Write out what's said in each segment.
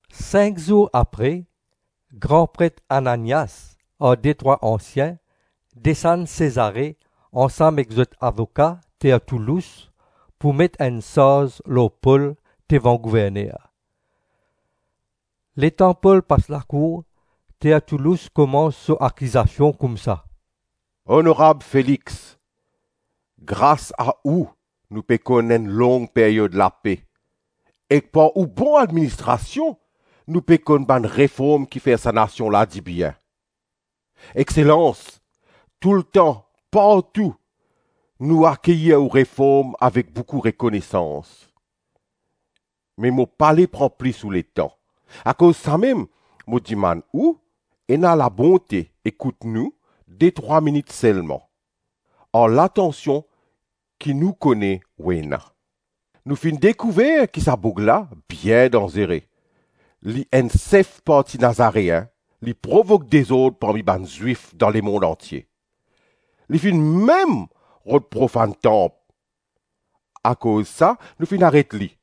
Sink zour apre, gran pret Ananias ar detrwa ansien desann Sezare ansam ek zot avoka Tertoulous pou met enn sarz lor Pol devan gouverner. Letan Pol pas lakour, Tertoulous koumans so akizasion koumsa: “Onorab Felix, gras a ou nou pe konn enn long peryod lape, ek par ou bon administrasion nou pe konn bann reform ki fer sa nasion la dibien. Exselans, toultan, partou, nou akeyir ou reform avek boukou rekonesans. Me mo pale pran plis ou letan, akoz samem mo dimann ou ena labonte ekout nou detrwa minit selma, ar latansion ki nou kone ou ena. Nou finn dekouver ki sa boug la bien danzere. Li enn sef parti Nazareen, li provok dezord parmi bann Zwif dan lemonn antie. Li finn mem rod profann tanp, akoz sa nou finn aret li.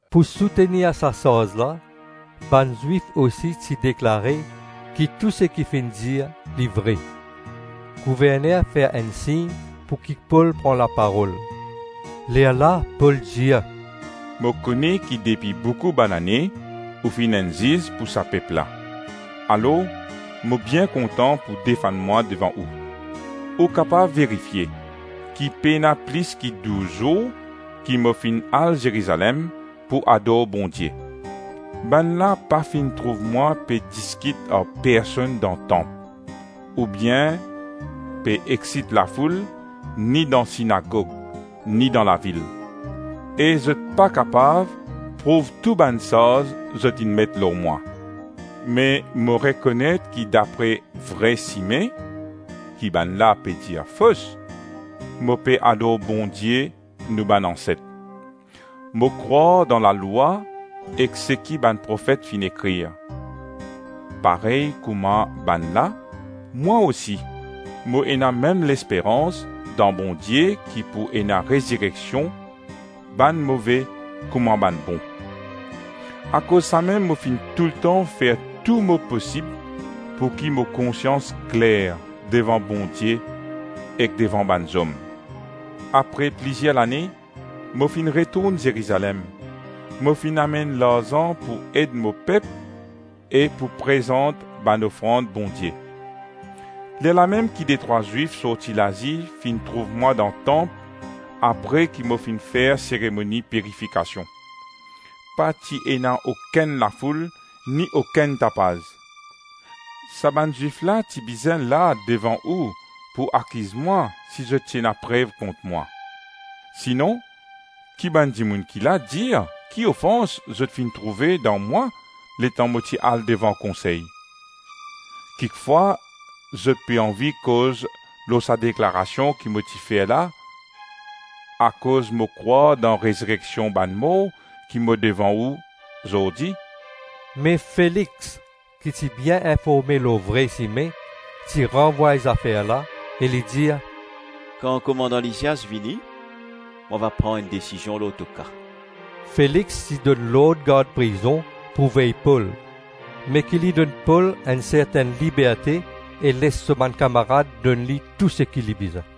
Pou soutenir sa sarz la, bann Zwif osi ti deklare ki tou seki finn dir li vre. Gouverner fer enn sign pouki Pol pran laparol. Lerla Pol dir, “Mo kone ki depi boukou banane ou finn enn ziz pou sa pep la, alors mo bien kontan pou defann mwa devan ou. Ou kapav verifie, ki pena plis ki douz zour ki mo finn al Zerizalem pou ador Bondie. Bannla pa finn trouv mwa pe diskit ar personn dan tanp, ou bien pe eksit lafoul ni dan sinagog, ni dan lavil. E zot pa kapav prouv tou bann sarz zot inn met lor mwa. Me mo rekonet ki dapre Vre Sime (ki bannla pe dir fos) mo pe ador Bondie nou bann anset. Mo krwar dan lalwa ek seki bann profet finn ekrir. Parey kouma bannla, mwa osi mo ena mem lesperans dan Bondie ki pou ena rezireksion bann move kouma bann bon. Akoz samem mo finn toultan fer tou mo posib pouki mo konsians kler devan Bondie ek devan bann zom. Apre plizir lane, mo finn retourn Zerizalem; mo finn amenn larzan pou ed mo pep e pou prezant bann ofrand Bondie. Lerlamem ki detrwa Zwif sorti Lazi finn trouv mwa dan tanp apre ki mo finn fer seremoni pirifikasion. Pa ti ena okenn lafoul ni okenn tapaz. Sa bann Zwif la ti bizin la devan ou pou akiz mwa si zot ti ena prev kont mwa. Sinon, ki bann dimoun ki la dir ki ofans zot finn trouve dan mwa letan mo ti al devan konsey. Kikfwa zot pe anvi koz lor sa deklarasion ki mo ti fer la: ‘Akoz mo krwar dan rezireksion bann mor ki mo devan ou zordi.’” Me Felix ki ti bien informe lor Vre Sime, ti ranvway zafer la e li dir, “Kan komandan Lisias vini mo va pran enn desizion lor to ka.” Felix ti donn lord gard prizon pou vey Pol, me ki li donn Pol enn sertenn liberte e les so bann kamarad donn li touseki li bizin.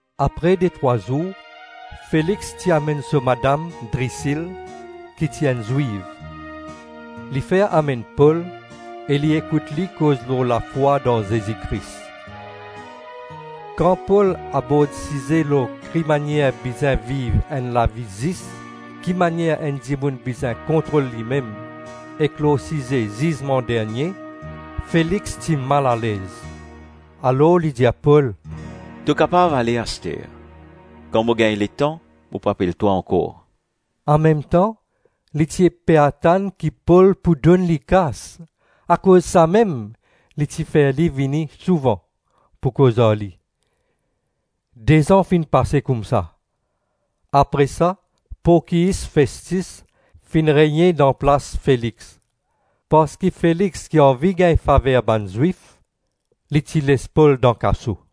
Apre detrwa zour Felix ti amenn so madam Drisil, ki ti enn Zwiv. Li fer amenn Pol e li ekout li koz lor lafwa dan Zezi Kris. Kan Pol abord size lor kimanier bizin viv enn lavi zis, kimanier enn dimoun bizin kontrol limem, ek lor size zizman dernie, Felix ti malalez, alor li dir Pol, “To kapav ale aster. Kan mo gagn letan, mo pou apel twa ankor.” Anmemtan, li ti pe atann ki Pol pou donn li kas. Akoz samem li ti fer li vini souvan pou koz ar li. De-zan finn pase koumsa, apre sa Porkyis Festis finn regne dan plas Felix. Parski Felix ti anvi gagn faver bann Zwif, li ti les Pol dan kaso.